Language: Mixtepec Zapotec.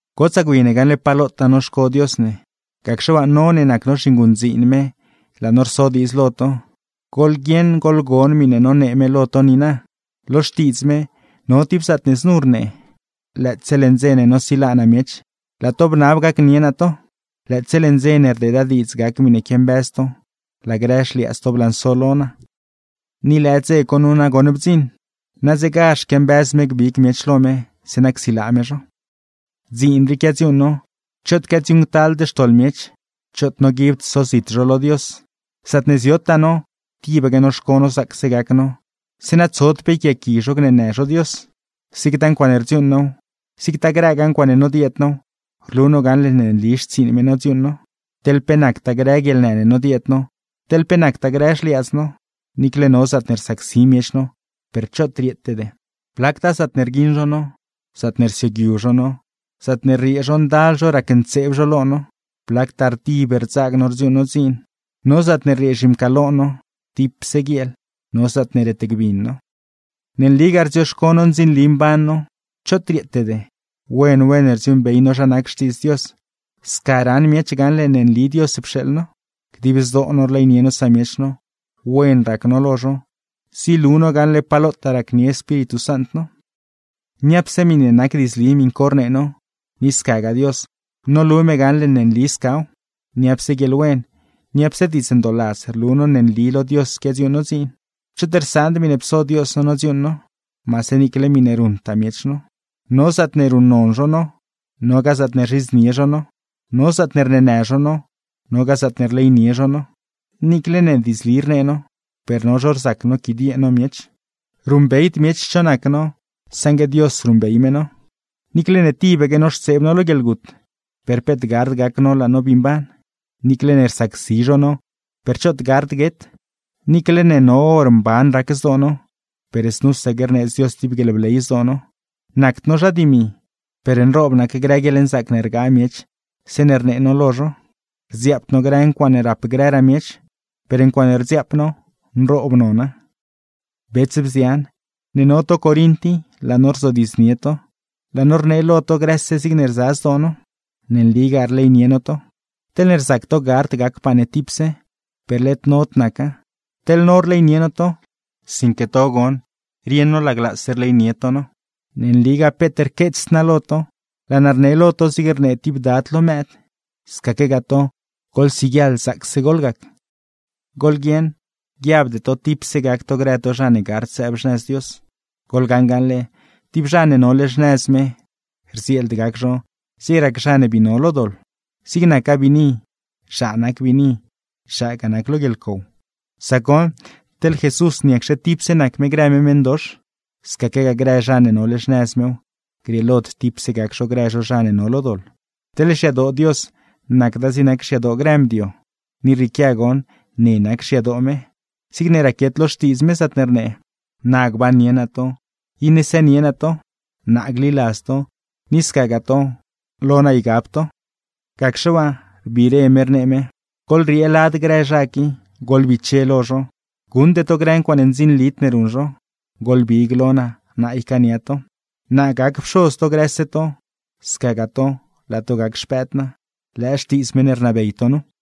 Gotsaa gwi ne gaṉle pa lotaa noxco Dios ne. Gacxe waa, no ne nac no zhinguṉdziin me laa no rso diidz lo to: goḻguieṉ goḻgon miṉe nonee me lo to niina. Lo Xtiidz me, no tib zaatne znu zhobnee: Lëëtse leṉ dze ne nosilaa naa miech, laa to bnab gacnie naa to. Lëëtse leṉ dze ne rdeeda diidz gac miṉe quiambëz to, laa grë xliaadz to blanso lo naa. ¡Ni lëë dze co nu nagoṉ bdziṉ! ¡Nadzegazh quiambëz me gbig miech lo me, zeeṉa csilaa me zho! Dziin rii quiadziuuṉ no, choot quiadziuuṉctald xtoḻ miech, choot noguibd sozit zho lo Dios. Zaatne ziotaa no, tibaque noxco no zaacse gac no, zeeṉa tsod pe yquiaaqui zho gneenë zho Dios. Zigtaa ncuaaṉe rdziuuṉ now, zigtaa grëgaa ncuaaṉe nodieed now, rlu no gaṉle ne nli xtsiiṉ me nodziuuṉ no. Teḻ pe nactaa grë guieḻnë ne nodieed no, teḻ pe nactaa grë xliaadz no, niicle no zaatne rsacsi miech no, per choot rieetede. Blactaa zaatne rguiṉ zho no, zaatne rsioogyu zho no, zaatne rriee zho ndal zho racntseeb zho lo no. Blactaa rdib rdzaag no rdziuuṉ no dziin, no zaatne rriee zhimcaalo no dipse guieel, no zaatne retgbin no. Ne nligaa rdzioxco no ndzinli mban no, choot rieetede, wen wen rdziuuṉbey no zha nac Xtiidz Dios, sca raṉ miech gaṉle ne nli Dios pxeeḻ no. Dib zdoo no rleynie no samiech no, wen rac no lo zho, zilu no gaṉle pa lotaa racnie Espíritu Sant no. Niapse miṉe nac diidzli miṉ co rnee no, ni scagaa Dios, nolu me gaṉle ne nli scaw. Niapse guieḻwen, niapse diidz ndooladz rlu no ne nli lo Dios quiadziuuṉ no dziin. Choot rsaand miṉe pso Dios no nodziuuṉ no, maase niicle miṉe ruṉtaa miech no. No zaatne ruṉnon zho no, nogaa zaatne rzhidznie zho no; no zaatne rneenë zho no, nogaa zaatne rleynie zho no. Niicle ne diidzli rnee no, per no zho rzac noquidiee no miech. Ruṉbeyd miech cho nac no, saṉgue Dios ruṉbey me no. Niicle ne tibaque noxtseeb no lo guieḻgut, per peet gard gac no laa no bii mban; niicle ne rsacsi zho no, per choot gard guet. Niicle ne no hor mban rac zdoo no, per znusaque rneedz Dios tib guieḻbley zdoo no. Nacd no zha dimi, per nroob nac grë guieḻnzaac ne rgaa miech zeeṉe rnee no lo zho. Rdziaapd no grë ncuaaṉe rap grëraa miech, per ncuaaṉe rdziaap no, nroob nona. Bets, bzian, ne no to Corint i, laa no rzodiidznie to, laa no rnee lo to grëse zigne rza zdoo no. Ne nligaa rleynie no to. Teḻne rzac to gard gacpaa ne tipse, per led nod naca. Teḻ no rleynie no to, sinque to goṉ rieṉ no laglaase rleynie to no. Ne nligaa peet rqueets naa lo to, laa naa rne lo to zig rnee tib dad lo mëëd. ¡Scaquegaa to, goḻsiguieḻ zaacse goḻgac! Goḻguieṉ, guiabde to tipse gac to grë to zha ne gard sëëb xnëz Dios. Goḻgaṉ gaṉle, tib zha ne nole xnëz me, rdzieeld gac zho zig rac zha ne bii no lo doḻ. Zig nacgaa biini, zhaa nac biini, zhaagaa nac lo guieḻcow. Sac goṉ, teḻ Jesús, ¿niacxe tipse nac me grë me meṉdox? Scaquegaa grë zha ne nole xnëz mew, grieelod tipse gac zho grë zho zha ne no lo doḻ. Teḻ xyadoo Dios, nacda zig nac xyadoo grë mdio. Ni rrieequia goṉ ne nac xyadoo me, zigne raquiet lo Xtiidz me zaatne rnee: Na gbannie naa to, iṉe sënie naa to. Naa gliladz to, ni scagaa to, lo naa ygab to. Gacxe waa, rbiire me rnee me: ¡Goḻriee lad grë zha qui, goḻbiche lo zho! Guṉde to grë ncuaaṉe ndzinlid ne ruṉ zho, goḻbig lo naa, naa ycaania to. Naa gac Pxoz to grëse to, scagaa to, laa to gac xpëëd naa. Lëë xtiidz meṉ ne rnabey to nu.